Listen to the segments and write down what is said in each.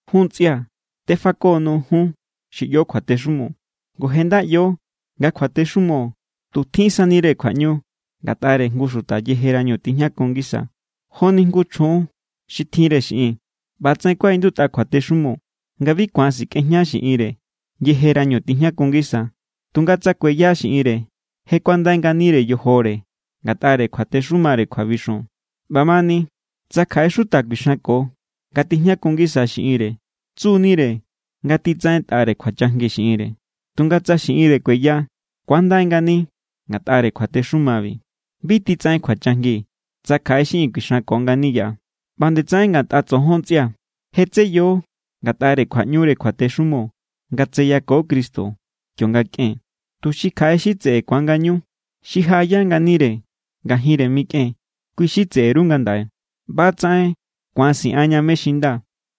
Jun ntsꞌia̱, tefako_nuu̱ jun xi ꞌyo kjuatexumo. Ngu je nda ꞌyo nga kjuatexumo tu tjinsani=re kjuaꞌñu ngatꞌare jngu xuta yejerañu tijñakun ngisa. Joni jngu chjun xi tjinre xiꞌin. ꞌBa=tsaꞌen kuaꞌindutꞌa kjuatexumo nga bi ku̱an sikꞌejña xiꞌinre yejerañu tijñakun ngisa. Tunga tsa kueya xiꞌinre, je kuandai nganire yojore ngatꞌare kjuatexumare kjuabixon. ꞌBamani tsa kjaꞌe xuta kuixanko nga tijñakun ngisa xiꞌinre, tsu=nire nga titsaꞌentꞌare kjuachajngi xiꞌinre. Tunga tsa xiꞌinre kueya, ku̱andai ngani ngatꞌare kjuatexumabi. Bi titsaꞌen kjuachajngi tsa kjaꞌe xiꞌin kuixanko ngani yaꞌa. ꞌBa nde tsaꞌen ngatꞌa tsojon ntsꞌia̱. Je= tseyo ngatꞌare kjuaꞌñure kjuatexumo nga tseyako Cristo kionga kꞌen, tuxi kjaꞌe xi tseꞌe ku̱an ngañu. Xi jaꞌaya nganire ngajinre mikꞌen, kui= xi tseꞌe_ru ngandaꞌe. ꞌBa=tsaꞌen ku̱an siꞌanña mé= xi nda,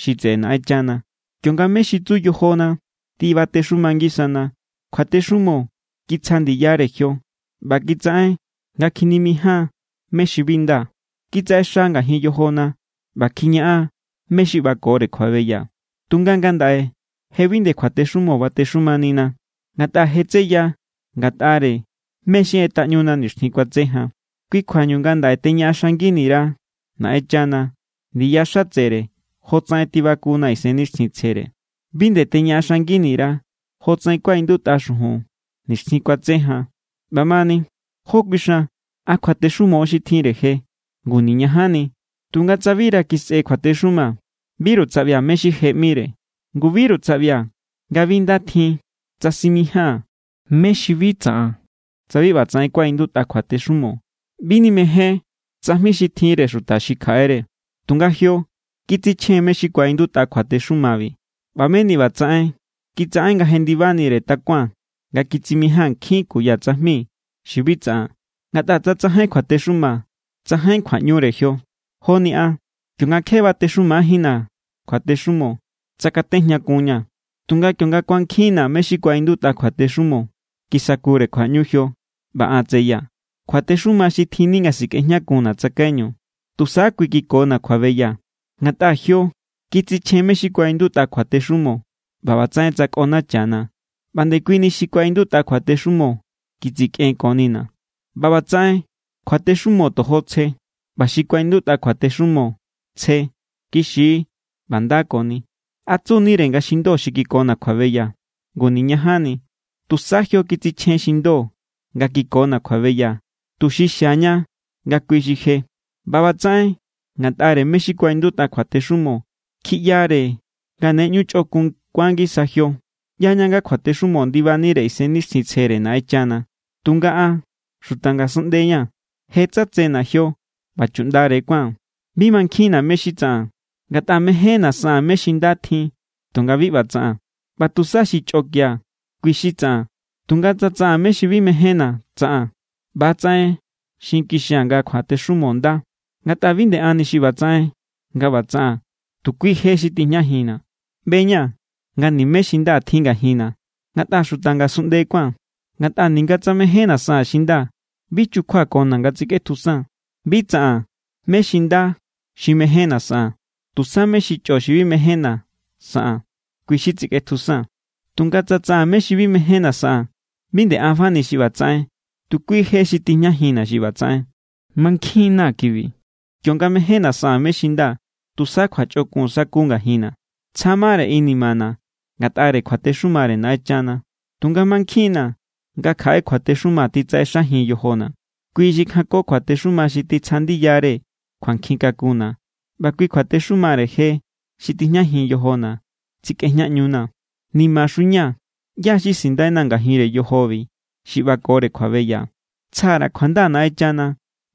xi tseꞌe Naꞌenchana. Kionga mé= xi tsu yojona tibatexuma ngisana, kjuatexumo kitsja ndiyare jio ꞌba kitsaꞌen nga kjinimijáan mé= xi bi nda. Kitsaꞌexa ngajin yojona ꞌba kjiñaꞌan mé= xi ꞌbakore kjuabeya. Tunga ngandaꞌe je bi nde kjuatexumo batexumanina, ngatꞌa je= tseya ngatꞌare mé= xi ꞌetꞌaꞌñuna nixtjin kuatse jan. Kui kjuañu ngandaꞌe teñaꞌaxangini_ra Naꞌenchana ndiya xatsere jotsaꞌen tibakuna Isennixtjintsjere. Bi nde teñaꞌaxangini_ra jotsaꞌen kuaꞌindutꞌa xujun nixtjin kuatse jan. ꞌBamani, ¿jó kuixan? ¿A kjuatexumo xi tjinre je? ¡Ngu niñajanni! Tunga tsa bira kisꞌe kjuatexuma, biru tsaꞌbia̱ mé= xi je ꞌmire. Ngu, biru tsaꞌbia̱ nga bi nda tjin tsa simijáa̱n mé= xi bi tsaꞌan tsa bi ꞌbatsaꞌen kuaꞌindutꞌa kjuatexumo: “Bi nimején tsajmi xi tjinre xuta xi kjaꞌere.” Tunga jio kitsichjen mé= xi kuaꞌindutꞌa kjuatexumabi ꞌba meni ꞌbatsaꞌen kitsaꞌen nga jendibanire takuaa̱n nga kitsimijáa̱n nkjin kuya tsajmi xi bi tsaꞌan. Ngatꞌa tsa tsajain kjuatexuma, tsajain kjuaꞌñure jio. Joni an. Kionga kje batexumajínna̱ kjuatexumo, tsakatejñakunña̱. Tunga kionga kuankjinna̱ mé= xi kuaꞌindutꞌa kjuatexumo, kisakure kjuaꞌñu jio, ꞌba an tseyaa̱. Kjuatexuma xi tjinni nga sikꞌejñakunna̱ tsakaiñu, tusa kui kikona̱ kjuabeya. Ngatꞌa jio kitsichjen mé= xi kuaꞌindutꞌa kjuatexumo ꞌba ꞌbatsaꞌen tsꞌakonachana̱. ꞌBa ndekuini xi kuaꞌindutꞌa kjuatexumo kitsikꞌenkonina̱. ꞌBa ꞌbatsaꞌen kjuatexumo tojo tsje. ꞌBa xi kuaꞌindutꞌa kjuatexumo tsje, kixi= ꞌba nda koni. ¿A tsu=nire nga xi ndo xi kikona̱ kjuabeya? ¡Ngu niñajanni! Tusa jio kitsichjen xi ndo nga kikona̱ kjuabeya, tuxi xiaña nga kui xi je. ꞌBa ꞌbatsaꞌen ngatꞌare mé= xi kuaꞌindutꞌa kjuatexumo kjiꞌyare nga ne ꞌñu chꞌokun kuan ngisa jio. ꞌYaña nga kjuatexumo ndibanire Isennixtjintsjere Naꞌenchana. Tunga an xuta ngasunꞌnde= ña̱. Je= tsatsena̱ jio ꞌba chuꞌndare kuáa̱n. Bi mankjinna̱ mé= xi tsaꞌaa̱n. Ngatꞌa mejénna̱ saꞌaa̱n mé= xi nda tjin tunga bi ꞌba tsaꞌaa̱n. ꞌBa tusa xi chꞌokia̱ kui= xi tsaꞌaa̱n. Tunga tsa tsaꞌaa̱n mé= xi bi mejénna̱ tsaꞌaa̱n, ꞌba=tsaꞌen xinkixia̱ nga kjuatexumo nda. Ngatꞌa bi nde anni xi ꞌbatsaꞌen nga ꞌba tsaꞌaa̱n, tu kui je xi tijñajinna̱. ꞌBe=ña̱ nga nimé xi nda tjin ngajinna̱ ngatꞌa xuta ngasunꞌnde kuáa̱n. Ngatꞌa ninga tsa mejénna̱ saꞌaa̱n xi nda, bi chukjuakona̱ nga tsikꞌetjusaa̱n. Bi tsaꞌaa̱n mé= xi nda xi mejénna̱ saꞌaa̱n. Tusa mé= xi chꞌo xi bi mejénna̱ saꞌaa̱n, kui= xi tsikꞌetjusaa̱n. Tunga tsa tsaꞌaa̱n mé= xi bi mejénna̱ saꞌaa̱n, bi nde an fani xi ꞌbatsaꞌen. Tu kui je xi tijñajinna̱ xi ꞌbatsaꞌen. Mankjin=na̱ kibi: kionga mejénna̱ saꞌaa̱n mé= xi nda, tusa kjuachꞌokun sa̱ku ngajinna̱. Tsja mare inimana̱ ngatꞌare kjuatexumare Naꞌenchana. Tunga mankjinna̱ nga kjaꞌe kjuatexuma titsaꞌexajin yojona̱. Kui xi kjanko kjuatexuma xi titsja ndiyare kjuankjin kakunna̱ ꞌba kui kjuatexumare je xi tijñajin yojona̱ tsikꞌejñaꞌñuna̱. ¡Nimaxu ña̱! ¿ꞌYá= xi sindaina̱ ngajinre yojobi xi ꞌbakore kjuabeya? ¡Tsja_ra̱ kjuanda Naꞌenchana!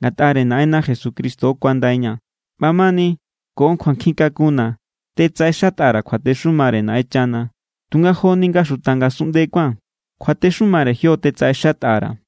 Ngatꞌare Naꞌenna Jesucristo kuandaiña̱. ꞌBamani ko kjuankjin kakunna̱ tetsaꞌenxatꞌa_ra̱ kjuatexumare Naꞌenchana, tunga joni nga xuta ngasunꞌnde kuáa̱n, kjuatexumare jio tetsaꞌexatꞌa_ra̱.